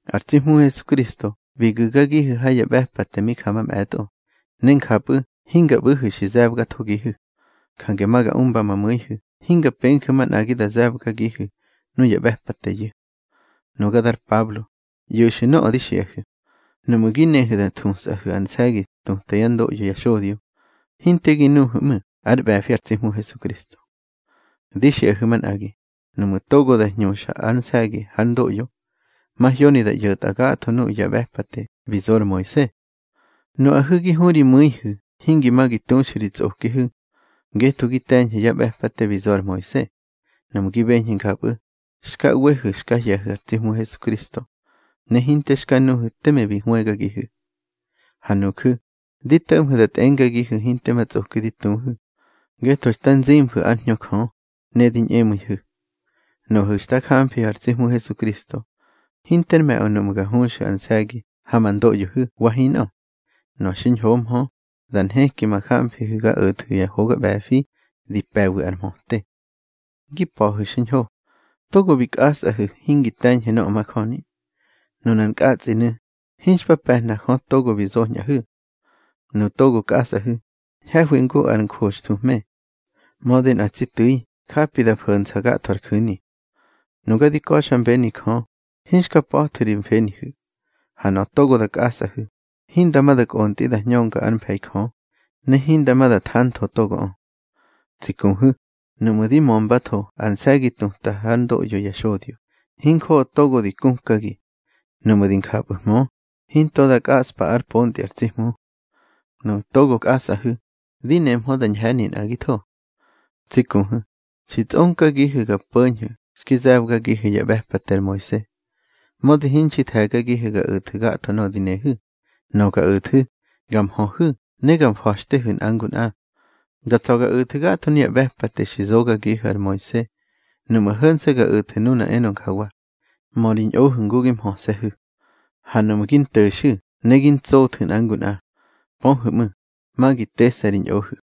Ar tsi Hmu Hesukristo bi gu̱gagihu̱ ha ya ꞌbe̱pate mi ja mamꞌe̱tꞌo, ne njapꞌu̱ hinga ꞌbu̱hu̱ xi ze̱bgathogihu̱. Jange ma ga umba ma mu̱ihu̱ hinga penju̱ manꞌagi da ze̱bgagihu̱ nuya ꞌbe̱pateyu̱. Nuga dar Pablo, ꞌyo̱xu̱ nöꞌö di xiꞌahu̱: Nuꞌmu̱ gi nehu̱ da thusꞌahu̱ ar nse̱gi tuta yá ndoꞌyo ya xodyo, hinte gi nuhu̱ ꞌmu̱ ár ꞌbe̱fi ar tsi Hmu Hesukristo. Di xiꞌahu̱ manꞌagi, nuꞌmu̱ togo da hñuxa ar nse̱gi hár ndoꞌyo, mahyoni da ꞌyo̱tꞌa gatho nuꞌu̱ ya ꞌbe̱pate bi zo ar Moise. Nuꞌahu̱ gi hurimu̱ihu̱ hingi ma gi tuxu̱ ri tsꞌokihu̱ ngetho gi te̱ñhu̱ ya ꞌbe̱pate bi zo ar Moise. Nuꞌmu̱ gi beñhu̱ njapꞌu̱, xka ꞌwehu̱ xka hye̱hu̱ ar tsi Hmu Hesukristo, ne hinte xka nuhu̱ teme xi hwëgagihu̱. Ha nuju̱, di to̱ꞌmhu̱ da tꞌengagihu̱ hinte ma tsꞌoki di tuhu̱ ngetho xta nzimfu̱ ár Hñö Jö, ne di ñꞌemu̱ihu̱. Nuꞌu̱ xta jamfihu̱ ar tsi Hmu Hesukristo, hinter me̱ꞌö nuꞌmu̱ ga huxu̱ ar nse̱gi ha ma ndoꞌyohu̱ wa hinꞌö. Nöꞌö xiñhohmö, da nheki ma jamfihu̱ ga o̱thu̱ ya hoga ꞌbe̱fi di pe̱wi ar mhöte. Ngi pa̱hu̱ xiñho. Togo bi kꞌasꞌahu̱ hingi te̱ñhu̱ nöꞌö majöni. Nunar nkꞌatsꞌinu̱, hinxpa pe̱hna Jö togo bi zoñꞌahu̱. Nuꞌu̱ togo kꞌasꞌahu̱, ñhe̱hwi ngu ar njoxthuhme, mödi nꞌar tsi tu̱i japi da fo̱nsa gatho ar ju̱ni. Nuga di ka̱xmbeni Jö, hinxka pa̱thu̱ ri mfenihu̱. Ha nöꞌö togo kꞌasꞌahu̱, hinda ma da kꞌontꞌi da hñönga ár mfe̱i Jö, ne hinda ma da thantho togoꞌö. Tsi kuhu̱, nuꞌmu̱ di mömbatho ar nse̱gi tuta hár ndoꞌyo ya xodyo, hinjoꞌo togo di kukagi. Nuꞌmu̱ di njapꞌu̱hmö, hinto da kꞌaꞌspa ár pontꞌi ar tsi Hmu. Nuꞌu̱ togo kꞌasꞌahu̱, di nehmö da ñhe̱ni nꞌagitho. Tsi kuhu̱, xi tsꞌonkagihu̱ ga po̱ñhu̱ xki ze̱bgagihu̱ yá ꞌbe̱pate ar Moise. Mödi hinxi the̱gagihu̱ ga o̱thu̱ gatho nöꞌö di nehu̱. Nöꞌö ga o̱thu̱, ga mhöhu̱ ne ga mfa̱xtehu̱ nꞌa ngu nꞌa. Da tsa̱ ga o̱thu̱ gatho nuya ꞌbe̱pate xi zogagihu̱ ar Moise nuꞌmu̱ ho̱nse̱ ga o̱thu̱ nuna enö njawa: Mö ri ñꞌohu̱ ngu gi mhöse̱hu̱. Ha nuꞌmu̱ gi nto̱xu̱ ne gi ntsothu̱ nꞌa ngu nꞌa, pöhu̱ ꞌmu̱, ma gi tese̱hu̱ ri ñꞌohu̱.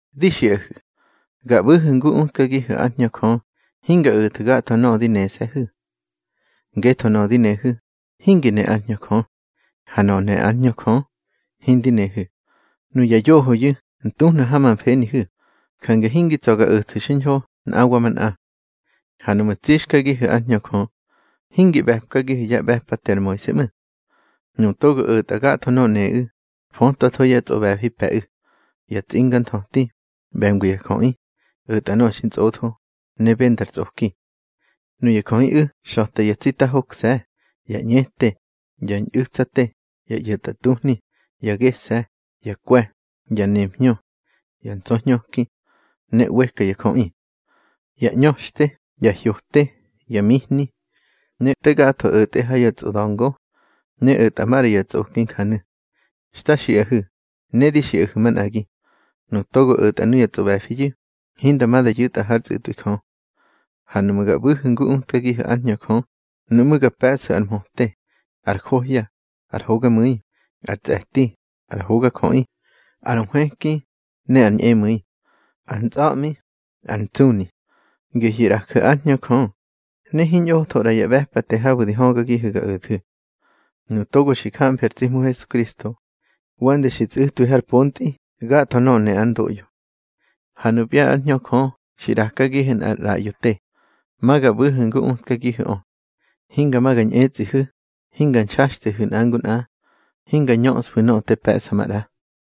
Di xiꞌahu̱, ga ꞌbu̱hu̱ ngu utgagihu̱ ár Hñö Jö, hinga o̱thu̱ gatho nöꞌö di nese̱hu̱. Ngetho nöꞌö di nehu̱, hingi ne ár Hñö Jö, ha nöꞌö ne ár Hñö Jö, hindi nehu̱. Nuya yohoyu̱ ntuhna ha ma mfenihu̱, jange hingi tsa ga o̱thu̱ xiñho nꞌa wa manꞌa. Ha nuꞌmu̱ tsixkagihu̱ ár Hñö Jö, hingi ꞌbe̱pkagihu̱ yá ꞌbe̱pate ar Moise ꞌmu̱. Nuꞌu̱ togo o̱tꞌa gatho nöꞌö neꞌu̱, fötwatho yá tsꞌoꞌbe̱fi pe̱ꞌu̱: Ya tsinganthöti, ꞌbe̱ngwi ya jöꞌi, o̱tꞌa nöꞌö xintsꞌotho, ne bendar tsꞌoki. Nuya jöꞌiꞌu̱ xa̱ta yá tsita hokse̱, ya ñꞌete, ya ñꞌu̱tsate, ya ꞌyo̱tꞌatuhni, ya gese̱, ya kwe̱, ya nemhñö, ya ntsa̱hñöki, ne ꞌweka ya jöꞌi. Ya ꞌñöxte, ya hyote, ya mihni, ne te gatho o̱tꞌe ha ya tsꞌoda̱ngo, ne o̱tꞌa maꞌra ya tsꞌoki njanu̱. Xta xiꞌahu̱, ne di xiꞌahu̱ manꞌagi, nuꞌu̱ togo o̱tꞌa nuya tsꞌoꞌbe̱fiyu̱, hinda ma da yu̱tꞌa hár tsꞌu̱tꞌwi Jö. Ha nuꞌmu̱ ga ꞌbu̱hu̱ ngu utkagihu̱ ár Hñö Jö, nuꞌmú̱ ga pe̱ꞌsu̱ ar mhöte, ar johya, ar hogamu̱i, ar tsꞌe̱ti, ar hogajöꞌi, ar nhwëki, ne ar ñꞌemu̱i, ar ntsꞌa̱ꞌmi, ar ntsuni. Gehyu̱ ꞌraju̱ ár Hñö Jö, ne hiñꞌotho ꞌra ya ꞌbe̱pate habu̱ di högagihu̱ ga o̱thu̱. Nuꞌu̱ togo xi jamfi ar tsi Hmu Hesukristo, wande xi tsꞌu̱twi har pontꞌi gatho nöꞌö ne ár ndoꞌyo. Ha nupya ár Hñö Jö xi ꞌrakagihu̱ nꞌar ꞌraꞌyo te, ma ga ꞌbu̱hu̱ ngu utkagihu̱ꞌö. Hinga ma ga ñꞌetsꞌihu̱, hinga nxaxtehu̱ nꞌa ngu nꞌa, hinga ñöꞌsfu̱ nöꞌö te pe̱ꞌsa maꞌra.